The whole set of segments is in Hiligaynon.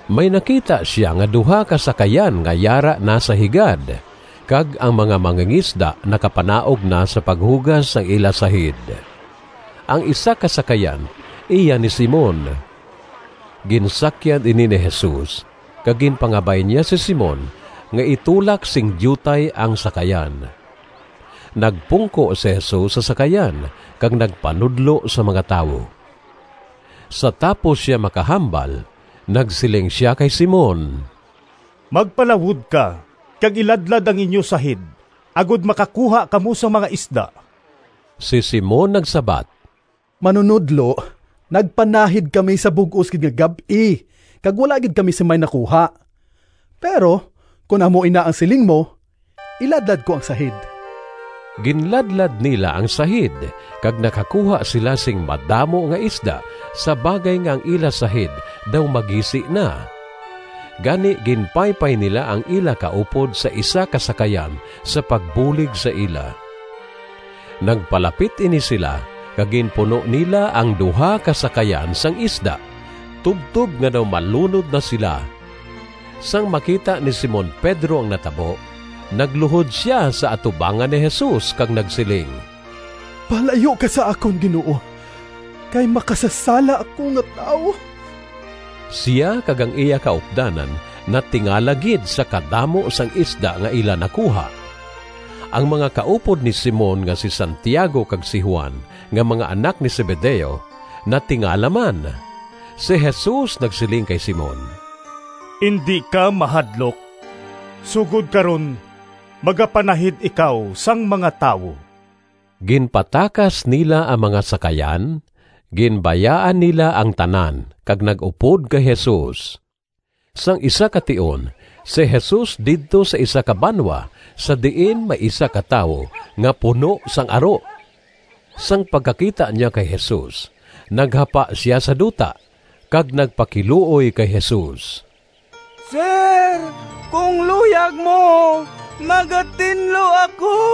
May nakita sia nga duha ka sakayan nga yara na sa higad, kag ang mga mangingisda nakapanaog na sa paghugas sang ila sahid. Ang isa ka sakayan iya ni Simon. Ginsakyan ini ni Jesus kag ginpangabay niya si Simon nga itulak sing diutay ang sakayan. Nagpungko si Jesus sa sakayan kag nagpanudlo sa mga tawo. Sa tapos sia makahambal, nagsiling sia kay Simon, “Magpalawod ka kag iladlad ang inyo sahid, agod makakuha kamo sang mga isda.” Si Simon nagsabat, “Manunodlo, nagpanahid kami sa bug-os gid nga gab-i kag wala gid kami sing may nakuha. Pero kon amo ina ang siling mo, iladlad ko ang sahid.” Ginladlad nila ang sahid kag nakakuha sila sing madamo nga isda sa bagay nga ang ila sahid daw magisi na. Gani ginpaypay nila ang ila kaupod sa isa ka sakayan sa pagbulig sa ila. Nagpalapit ini sila kag ginpuno nila ang duha ka sakayan sang isda tubtob nga daw malunod na sila. Sang makita ni Simon Pedro ang natabo, nagluhod sia sa atubangan ni Jesus kag nagsiling, “Palayo ka sa akon, Ginoo, kay makasasala ako nga tawo.” Sia kag ang iya kaupdanan natingala gid sa kadamo sang isda nga ila nakuha. Ang mga kaupod ni Simon nga si Santiago kag si Juan, nga mga anak ni Zebedeo, natingala man. Si Jesus nagsiling kay Simon, “Indi ka mahadlok. Sugod karon magapanahid ikaw sang mga tawo.” Ginpatakas nila ang mga sakayan, ginbayaan nila ang tanan kag nag-upod kay Jesus. Sang isa ka tion si Jesus didto sa isa ka banwa sa diin may isa ka tawo nga puno sang aro. Sang pagkakita niya kay Jesus naghapa sia sa duta kag nagpakiluoy kay Jesus, “Sir, kon luyag mo, magatinlo ako!”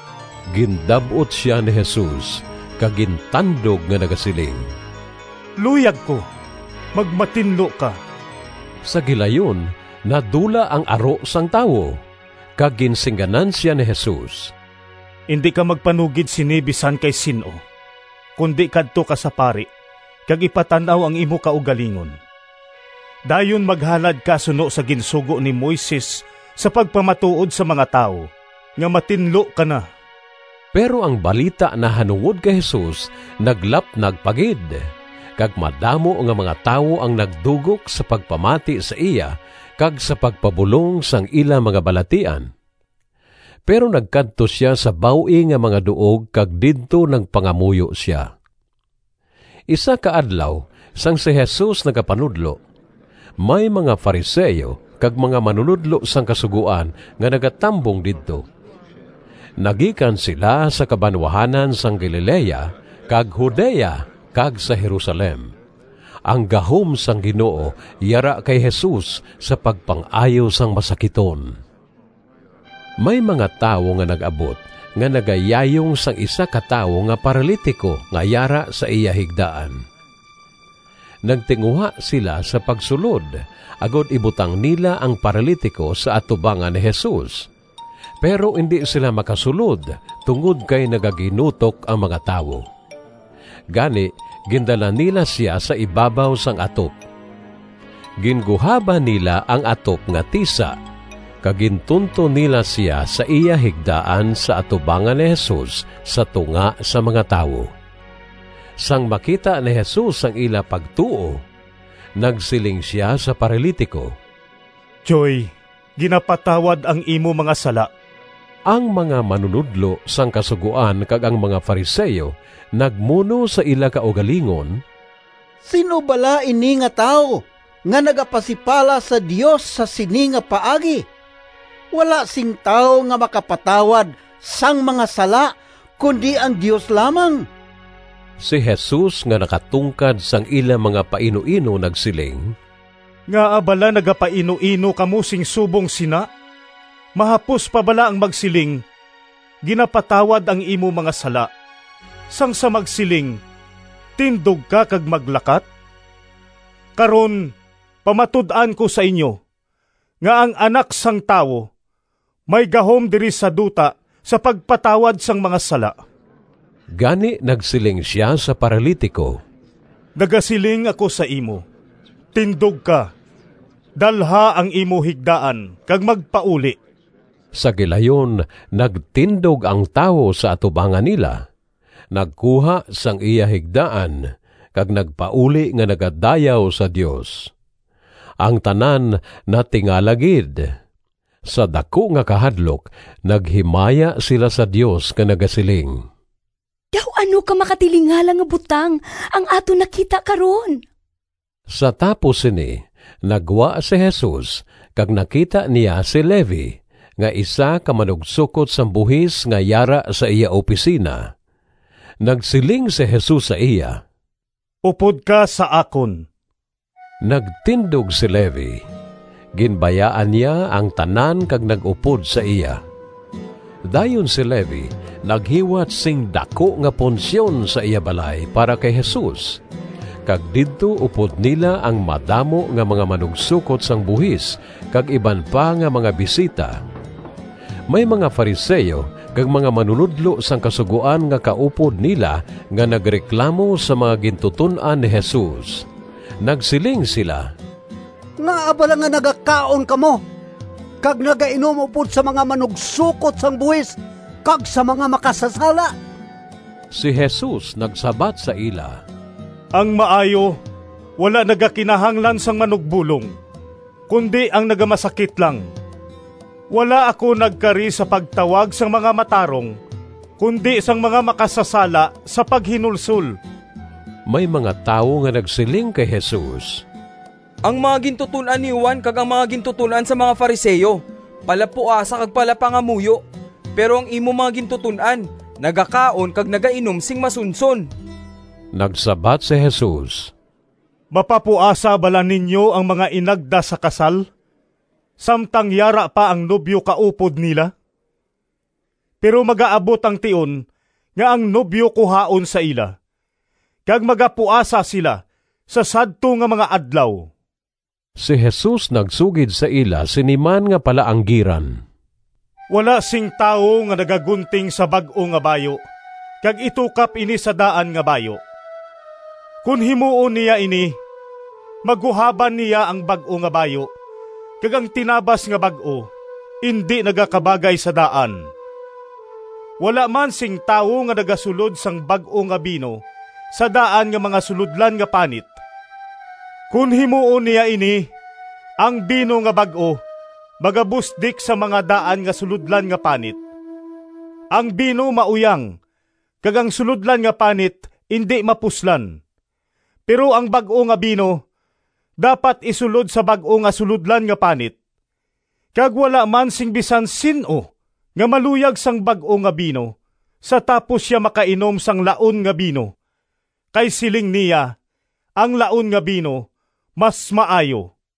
Gindab-ot sia ni Jesus kag gintandog nga nagasiling, “Luyag ko! Magmatinlo ka!” Sa gilayon nadula ang aro sang tawo. Kag ginsingganan sia ni Jesus, “Indi ka magpanugid sini bisan kay sin-o, kundi kadto ka sa pari kag ipatan-aw ang imo kaugalingon. Dayon maghalad ka suno sa ginsugo ni Moises sa pagpamatuod sa mga tawo nga matinlo ka na.” Pero ang balita nahanungod kay Jesus naglapnag pa gid, kag madamo nga mga tawo ang nagdugok sa pagpamati sa iya kag sa pagpabulong sang ila mga balatian. Pero nagkadto sia sa baw-ing nga mga duog kag didto nagpangamuyo sia. Isa ka adlaw sang si Jesus nagapanudlo, may mga Fariseo kag mga manunodlo sang Kasugoan nga nagatambong didto. Nagikan sila sa kabanwahanan sang Galilea kag Judea kag sa Jerusalem. Ang gahom sang Ginoo yara kay Jesus sa pagpang-ayo sang masakiton. May mga tawo nga nag-abot nga nagayayong sang isa ka tawo nga paralitiko nga yara sa iya higdaan. Nagtinguha sila sa pagsulod agod ibutang nila ang paralitiko sa atubangan ni Jesus, pero indi sila makasulod tungod kay nagaginutok ang mga tawo. Gani gindala nila sia sa ibabaw sang atop. Ginguhaban nila ang atop nga tisa, kag gintunton nila sia sa iya higdaan sa atubangan ni Jesus sa tunga sang mga tawo. Sang makita ni Jesus ang ila pagtuo, nagsiling sia sa paralitiko, “Tyoy, ginapatawad ang imo mga sala.” Ang mga manunodlo sang Kasugoan kag ang mga Fariseo nagmuno sa ila kaugalingon, “Sin-o bala ini nga tawo nga nagapasipala sa Dios sa sini nga paagi? Wala sing tawo nga makapatawad sang mga sala, kundi ang Dios lamang.” Si Jesus nga nakatungkad sang ila mga painuino nagsiling, “Ngaa bala nagapainuino kamo sing subong sina? Mahapos pa bala ang magsiling, ‘Ginapatawad ang imo mga sala,’ sang sa magsiling, ‘Tindog ka kag maglakat’? Karon pamatud-an ko sa inyo, nga ang Anak sang Tawo may gahom diri sa duta sa pagpatawad sang mga sala.” Gani nagsiling sia sa paralitiko, “Nagasiling ako sa imo, tindog ka, dalha ang imo higdaan kag magpauli.” Sa gilayon nagtindog ang tawo sa atubangan nila, nagkuha sang iya higdaan kag nagpauli nga nagadayaw sa Dios. Ang tanan natingala gid. Sa daku nga kahadlok naghimaya sila sa Dios nga nagasiling, “Daw ano ka makatilingala nga butang ang aton nakita karon.” Sa tapos sini naggwa si Jesus kag nakita niya si Levi nga isa ka manugsokot sang buhis nga yara sa iya opisina. Nagsiling si Jesus sa iya, “Upod ka sa akon.” Nagtindog si Levi, ginbayaan niya ang tanan kag nag-upod sa iya. Dayon si Levi naghiwat sing daku nga punsyon sa iya balay para kay Jesus, kag didto upod nila ang madamo nga mga manugsokot sang buhis kag iban pa nga mga bisita. May mga Fariseo kag mga manunodlo sang Kasugoan nga kaupod nila nga nagreklamo sa mga gintuton-an ni Jesus. Nagsiling sila, “Ngaa bala nga nagakaon kamo kag nagainom upod sa mga manugsokot sang buhis kag sa mga makasasala?” Si Jesus nagsabat sa ila, “Ang maayo wala nagakinahanglan sang manugbolong, kundi ang nagamasakit lang. Wala ako nagkari sa pagtawag sang mga matarong, kundi sang mga makasasala sa paghinulsol.” May mga tawo nga nagsiling kay Jesus, “Ang mga gintuton-an ni Juan kag ang mga gintuton-an sang mga Fariseo palapuasa kag palapangamuyo, pero ang imo mga gintuton-an nagakaon kag nagainom sing masunson.” Nagsabat si Jesus, “Mapapuasa bala ninyo ang mga inagda sa kasal samtang yara pa ang nobyo kaupod nila? Pero magaabot ang tion nga ang nobyo kuhaon sa ila, kag magapuasa sila sa sadto nga mga adlaw.” Si Jesus nagsugid sa ila sini man nga palaanggiran, “Wala sing tawo nga nagagunting sa bag-o nga bayu kag itukap ini sa daan nga bayu. Kon himuon niya ini, maguhaban niya ang bag-o nga bayu kag ang tinabas nga bag-o indi nagakabagay sa daan. Wala man sing tawo nga nagasulod sang bag-o nga bino sa daan nga mga sulodlan nga panit. Kon himuon niya ini, ang bino nga bag-o magabusdik sang mga daan nga sulodlan nga panit, ang bino mauyang, kag ang sulodlan nga panit indi mapuslan. Pero ang bag-o nga bino dapat isulod sa bag-o nga sulodlan nga panit. Kag wala man sing bisan sin-o nga maluyag sang bag-o nga bino sa tapos sia makainom sang laon nga bino. Kay siling niya, ‘Ang laon nga bino mas maayo.’”